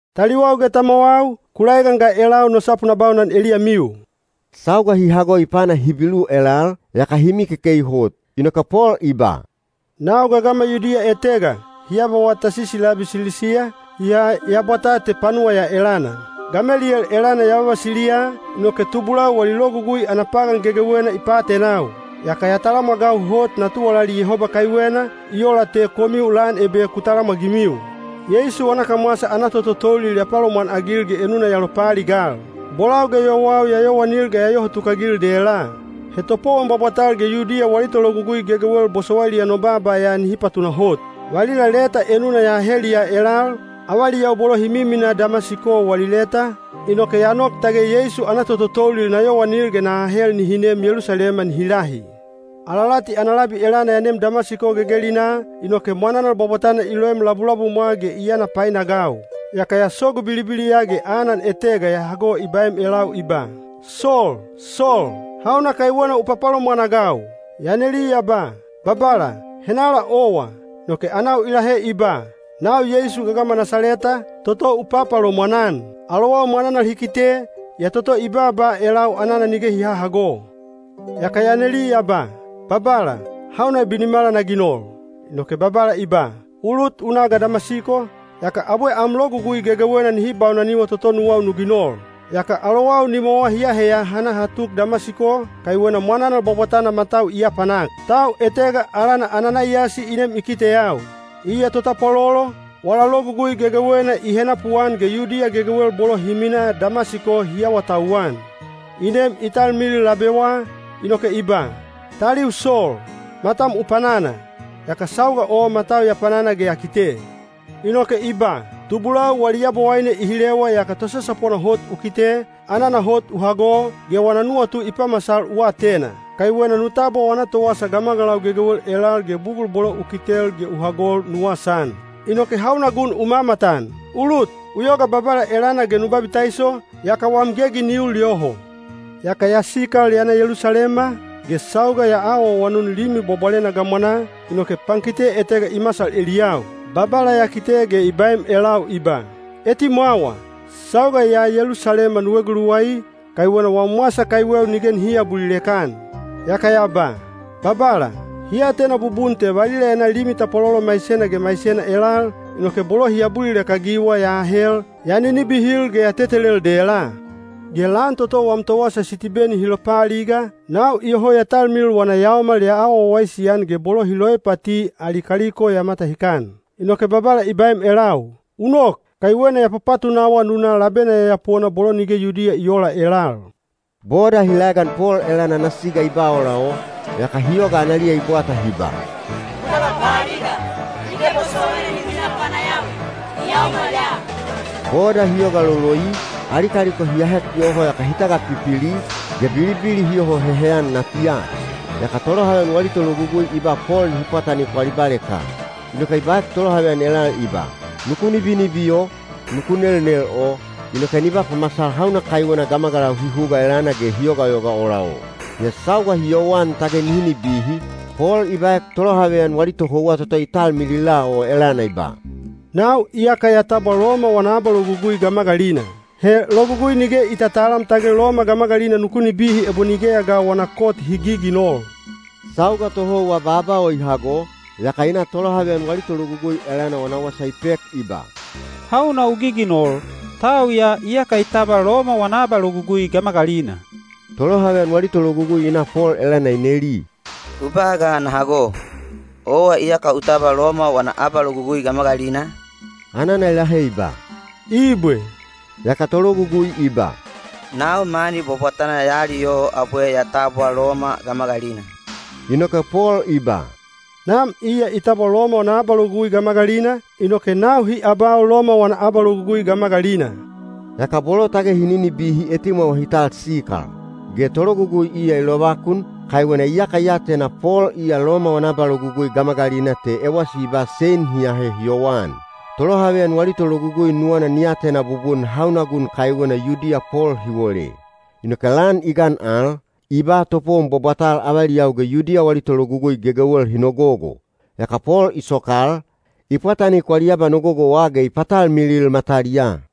“Taliwau ge tamwawau, ku laegan ga elau no sapu na baunan eliyamiu.” Sauga hi hago i pana Hibilu elal, yaka hi mikekei hot. Inoke Pol i ba, “Nau gagama Yudiya etega, hi abawa Tasisi labi Silisiya, yaa ya bwataa te panuwa ya elana. Gameliyel elana ya vavasiliya, inoke tubulau wali Logugui ana pagan gegewena i paatenau. Yaka ya talamwagau hot na tuwalali Yehoba kaiwena, i ola te komiu lan ebe ku talamwagimiu. Yeisu wana kamwasa ana tototoulil ya palomwanagil ge enuna ya lopaaligal. Bolau ge yowau ya yowanil ge ya yoho tukagil dela. He topowon bwabwatal ge Yudiya wali tologugui gegewel bosowailiya no baaba ya nihi patunahot. Valila leta enuna ya aheliya elal, avaliyau bolo hi miminaa Damasiko wali leta, inoke ya nok tage Yeisu ana tototoulil na yowanil ge na ahel nihi nem Yelusalema nihi lahi. Alalati ana labi elana ya nem Damasiko gegelinaa, inoke mwananal bwabwatana i loem labulabumwa ge i yana painagau. Yaka ya sogu bilibiliya ge anan etega ya hago i baem elau i ba, ‘Sol! Sol! Hauna kaiwena u papalomwan-agau?’ Ya neli ya ba, ‘Babala, henala owa?’ Inoke anau i lahe i ba, ‘Nau Yeisu gagama Nasaleta, toto u papalomwan-an.’ Alowau mwananal hi kite, yaa toto i baaba elau anana nige hi hahago. Yaka ya neli ya ba, ‘Babala, hauna binimala na ginol?’ Inoke Babala i ba, ‘U lut u na ga Damasiko, yaka abwe am logugui gegewena nihi baunaniwa toto nuwau nu ginol.’ Yaka alowau nimwawa hi aheya ha na ha tuk Damasiko, kaiwena mwananal bwabwatana matau i apanak. Tau etega alana Ananaiyasi i nem i kiteyau. Iya totapwalolo, wala logugui gegewena i henapuan ge Yudiya gegewel bolo hi minaa Damasiko hi awatauwan. I nem i talmilil labewa, inoke i ba, ‘Taliu Sol, matam u panana!’ Yaka sauga o matau ya panana ge ya kite. Inoke i ba, ‘Tubulau wali Yabowaine i hilewa yaka Tosasapona Hot u kite, anana hot u hago, ge wana nuwatu i pamasal u atena. Kaiwena nu tabwa wana towasa gamagalau gegewel elal ge bugul bolo u kitel ge u hagol nu wasaan. Inoke hauna gun u mamatan? U lut, u yoga Babala elana ge nu babitaiso, yaka wam gegi ni ul yoho.’ Yaka ya sikal ya na Yelusalema, ge sauga ya awaawanun Limi Bwabwalena gamwanaa, inoke pankite etega i masal eliyau. Babala ya kite ge i baem elau i ba, ‘Etimwawa! Sauga ya Yelusalema nu eguluwai, kaiwena wam wasa kaiweu nige nihi aabulilek-an.’ Yaka ya ba, ‘Babala, hi atena bubun te valila ya na limi tapwalolo maisena ge maisena elal, inoke bolo hi abulilek-agiwa ya aahel, ya ninibihil ge ya tetelel dela. Ge lan toto wam towasa Sitibeni hi lopaaliga, nau iyoho ya talmilil wana yaomal ya awa wawaisi-an ge bolo hi loipati ali kaliko ya matahikan.’ Inoke Babala i baem elau, ‘U nok, kaiwena ya papatunawa nu na labena yayapona bolo nige Yudiya i oola elal.’” Boda hi laegan Pol elana ana siga i ba ola o, yaka hi yoga analiya i bwata hi ba, “Ku tagapaaliga! Nige bosowaina ni minaa panayawi, ni yaomal ya.” Boda hi yoga loloi, ali kaliko hi ahek yoho yaka hi tagapipili, ge bilibili hi yoho heheyan natiya. Yaka tolohaveyan wali tologugui i ba Pol nihi pwatanik wali baleka. Inoke i baek tolohaveyan elal i ba, “Nuku nibinibi o, nuku nelnel o, inoke ni ba pamasal hauna kaiwena gamagalau hi huga elana ge hi yogayoga ola o.” Yaa sauga hi yowan tage nihi nibihi, Pol i baek tolohaveyan wali tohouwa toto i talmilila o elana i ba, “Nau iyaka ya tabwa Loma wana abalogugui gamagalina. He logugui nige i tatalam tage Loma gamagalina nuku nibihi ebo nigeya ga wana kot hi giginol.” Sauga tohouwa baaba o i hago, yaka i na tolohaveyan wali tologugui elana wana wasa i pek i ba, “Hauna u giginol? Tau ya iyaka i tabwa Loma wana abalogugui gamagalina.” Tolohaveyan wali tologugui i na Pol elana i neli, “U ba ga na hago! Owa iyaka u tabwa Loma wana abalogugui gamagalina?” Anana i lahe i ba, “Ibwe.” Yaka tologugui i ba, “Nau mani bwabwatana ya aliyoho abwe ya tabwa Loma gamagalina.” Inoke Pol i ba, “Nam iya i tabwa Loma wana abalogugui gamagalina, inoke nau hi abau Loma wana abalogugui gamagalina.” Yaka bolo tage hi ninibihi etimwawa hi tal sikal. Ge tologugui iya i lovakun, kaiwena iyaka i atena Pol iya Loma wana abalogugui gamagalina te ewasi i ba sein hi ahe hi yowan. Tolohaveyan wali tologugui nuwana ni atena bubun hauna gun kaiwena Yudiya Pol hi wole. Inoke lan i gan al, i ba topowon bwabwatal avaliyau ge Yudiya wali tologugui gegewel hi nogogo. Yaka Pol i sokal, i pwatanik wali abanogogowa ge i patalmilil mataliyaa.